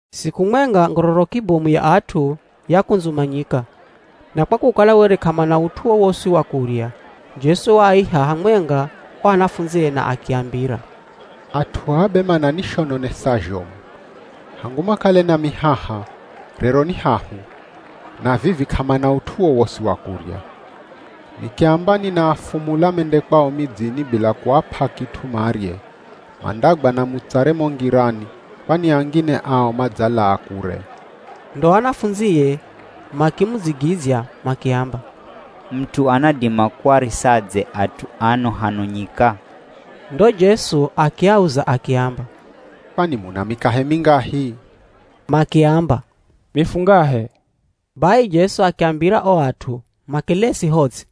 Siku mwenga ngororoki bomu ya at'u yakundzumanyika, na kwa kukala were k'amana ut'u wowosi wa kurya, Jesu waaiha hamwenga o anafundzie na akiambira, “At'u aa be mananishononesa zhomu. Hangu makale nami haha, rero ni hahu, na vivi k'amana ut'u wowosi wa kurya. Nikiamba ninaafumula mende kwao midzini bila kuap'a kit'u marye, mandagwa na mutsare mo ngirani kwani angine ao madzalaa kure.” Ndo anafundzie makimudzigidzya makiamba, “Mut'u anadima kuarisadze at'u ano hano nyika?” Ndo Jesu akiauza akiamba, “Kwani muna mikahe mingahi?” Makiamba, “Mifungahe.” Bai Jesu akiambira o at'u, makelesi ho ts'i.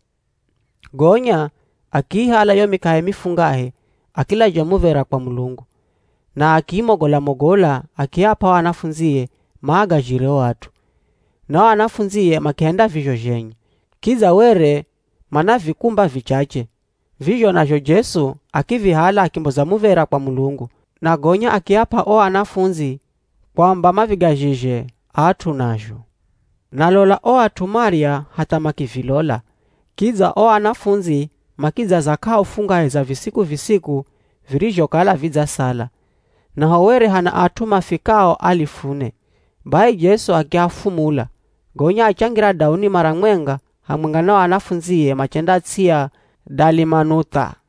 Gonya akiihala yo mikahe mifungahe, akilazha muv̱era kwa Mulungu, na akiimogola-mogola akiap'a o anafundzie maagazhire o at'u, na o anafundzie makihenda vizho zhenye. Kidza were mana vikumba vichache, vizho nazho Jesu akivihala akimboza muv̱era kwa Mulungu, na gonya akiap'a o anafundzi kwamba mavigazhizhe at'u nazho. Na lola o at'u marya hatha makivilola, kidza o anafundzi makidzaza k'ahu fungahe za visiku-visiku virizhokala vidzasala. Naho were hana at'u mafikao alifu ne. Bai Jesu akiafumula, gonya achangira dauni mara mwenga hamwenga na o anafundzie machenda ts'i ya Dalimanuth'a.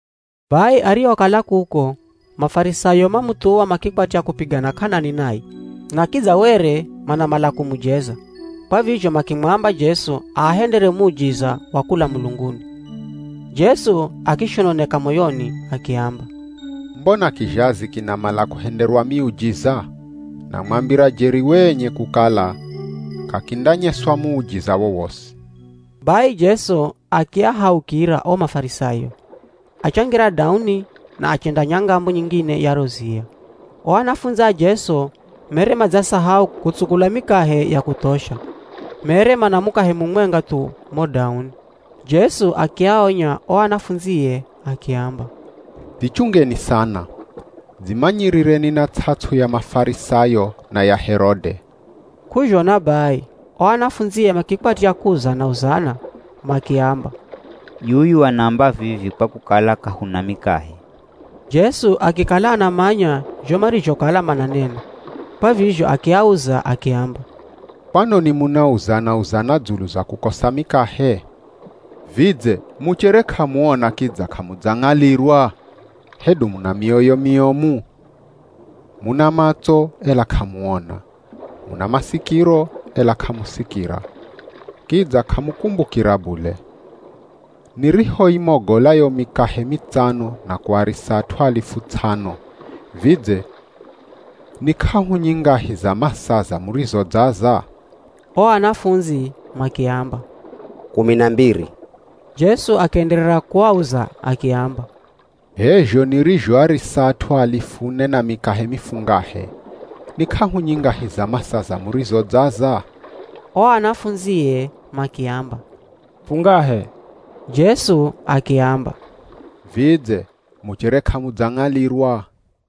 Bai arihokala kuko, Mafarisayo mamuthuwa makikwatya kupigana k'anani naye. Na kidza were manamala kumujeza, kwa vizho makimwamba Jesu aahendere muujiza wa kula mulunguni. Jesu akishononeka moyoni akiamba, “Mbona kizhazi kinamala kuhenderwa miujiza? Namwambira jeri wenye kukala k'akindanyeswa muujiza wowosi.” Bai Jesu akiahaukira o Mafarisayo, achangira dauni na achenda nyangamo nyingine ya ro ziya. O anafundzi a Jesu mere madzasahau kutsukula mikahe ya kuthosha, mere mana mukahe mumwenga thu mo dauni. Jesu akiaonya o anafundzie akiamba, “Dzichungeni sana. Dzimanyirireni na ts'ats'u ya Mafarisayo na ya Herode.” K'uzhona bai o anafundzie makikwatya kuuzana-uzana makiamba, “Yuyu anaamba vivi kwa kukala k'ahuna mikahe.” Jesu akikala anamanya zho marizhokala mananena, kwa vizho akiauza akiamba, “Kwanoni munauzana-uzana dzulu za kukosa mikahe? Vidze muchere k'amuona kidza k'amudzang'alirwa? Hedu muna mioyo miomu? Muna matso, ela k'amuona! Muna masikiro, ela k'amusikira. Kidza k'amukumbukira bule. Nirihoimogola yo mikahe mitsano na kuarisa at'u alifu ts'ano, vidze ni k'ahu nyingahi za masaza murizodzaza?” O anafundzi makiamba, “Kumi na mbiri.” Jesu akienderera kuauza akiamba, “H'e zho nirizhoarisa at'u alifu ne na mikahe mifungahe, ni k'ahu nyingahi za masaza murizodzaza?” O anafundzie makiamba, “Fungahe.” Jesu akiamba, “Vidze muchere k'amudzang'alirwa?”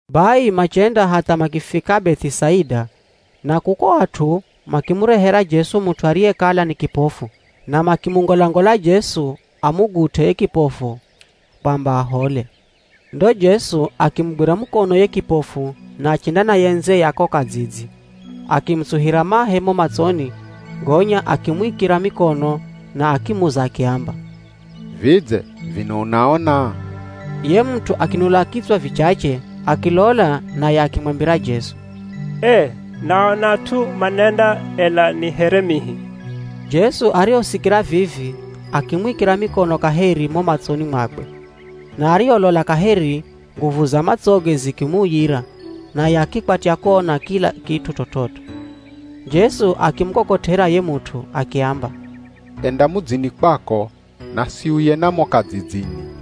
Bai machenda hatha makifika Beth'isaida, na kuko at'u makimurehera Jesu mut'u ariyekala ni kipofu na makimungolangola Jesu amugut'e ye kipofu kwamba ahole. Ndo Jesu akimugwira mukono ye kipofu na achenda naye ndze ya ko kadzidzi. Akimutsuhira mahe mo matsoni gonya akimuikira mikono na akimuza akiamba, “Vidze vino unaona?” Ye mut'u akinula kitswa vichache akilola naye akimwambira Jesu, “Ee naona at'u manenda, ela ni here mihi.” Jesu arihosikira vivi akimwikira mikono kaheri mo matsoni mwakwe, na ariholola kaheri nguvu za matsoge zikimuuyira naye akikwatya kuona kila kit'u t'ot'ot'o. Jesu akimukokot'era ye mut'u akiamba, “Enda mudzini kwako, na siuye na mo kadzidzini.”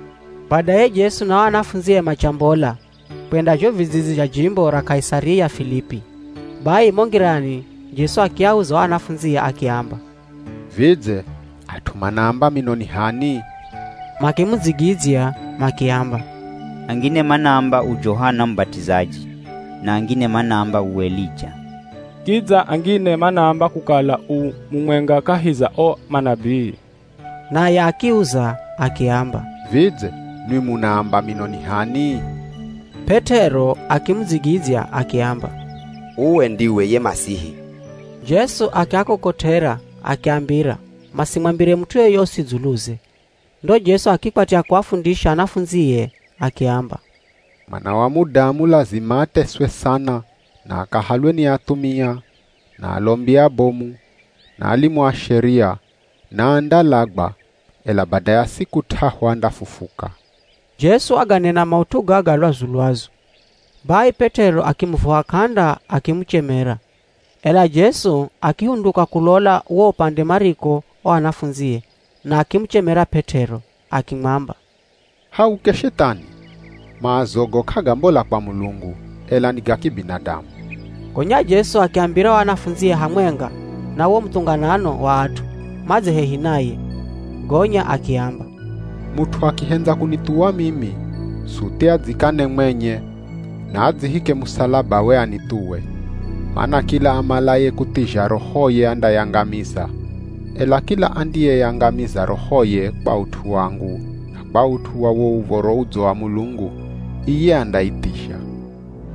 Badaye Jesu na o anafundzie machambola kwenda zho vidzidzi zha jimbo ra Kaisaria Filipi. Bai mo ngirani Jesu akiauza o anafundzie akiamba, “Vidze at'u manaamba mino ni h'ani?” Makimudzigidzya makiamba, “Angine manaamba u Johana Mubat'izaji, na angine manaamba u Elija, kidza angine manaamba kukala u mumwenga kahi za o manabii.” Naye akiuza akiamba, “Vidze nwi munaamba mino ni h'ani?” P'et'ero akimudzigidzya akiamba, “Uwe ndiwe ye Masihi.” Jesu akiakokot'era akiambira masimwambire mut'u yoyosi dzuluze. Ndo Jesu akikwatya kuafundisha anafundzie, akiamba, “Mwana wa Mudamu lazima ateswe sana na akahalwe ni athumia, na alombi abomu na alimu a Sheria, na andalagwa, ela bada ya siku t'ahu andafufuka.” Jesu waganena maut'u gaga lwazu-lwazu. Bai P'et'ero akimuvuha k'anda akimuchemera. Ela Jesu akihunduka kulola wo upande mariko o anafundzie na akimuchemera P'et'ero akimwamba, “Hauke Shethani! Maazogo k'agambola kwa Mulungu, ela ni ga kibinadamu.” Gonya Jesu akiambira o anafundzie hamwenga na wo muthunganano wa at'u madze hehi naye. Gonya akiamba, “Mut'u akihendza kunithuwa mimi, suthi adzikane mwenye, na adzihike musalabawe anithuwe. Mana kila amalaye kuthizha rohoye andayangamiza, ela kila andiyeyangamiza rohoye kwa ut'u wangu na kwa ut'u wa wo Uv̱oro Udzo wa Mulungu, iye andaithizha.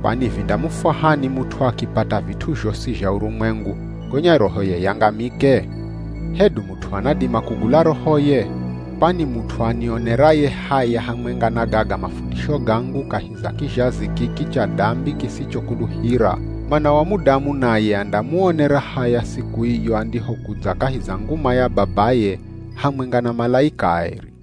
Kwani vindamufwahani mut'u akipata vit'u zhosi zha urumwengu, gonya rohoye yangamike? Hedu mut'u anadima kugula rohoye? Kwani mut'u anioneraye haya hamwenga na gaga mafundisho gangu kahi za kizhazi kiki cha dambi kisichokuluhira, Mwana wa Mudamu naye andamuonera haya siku iyo andihokudza kahi za nguma ya Babaye hamwenga na malaika aeri.”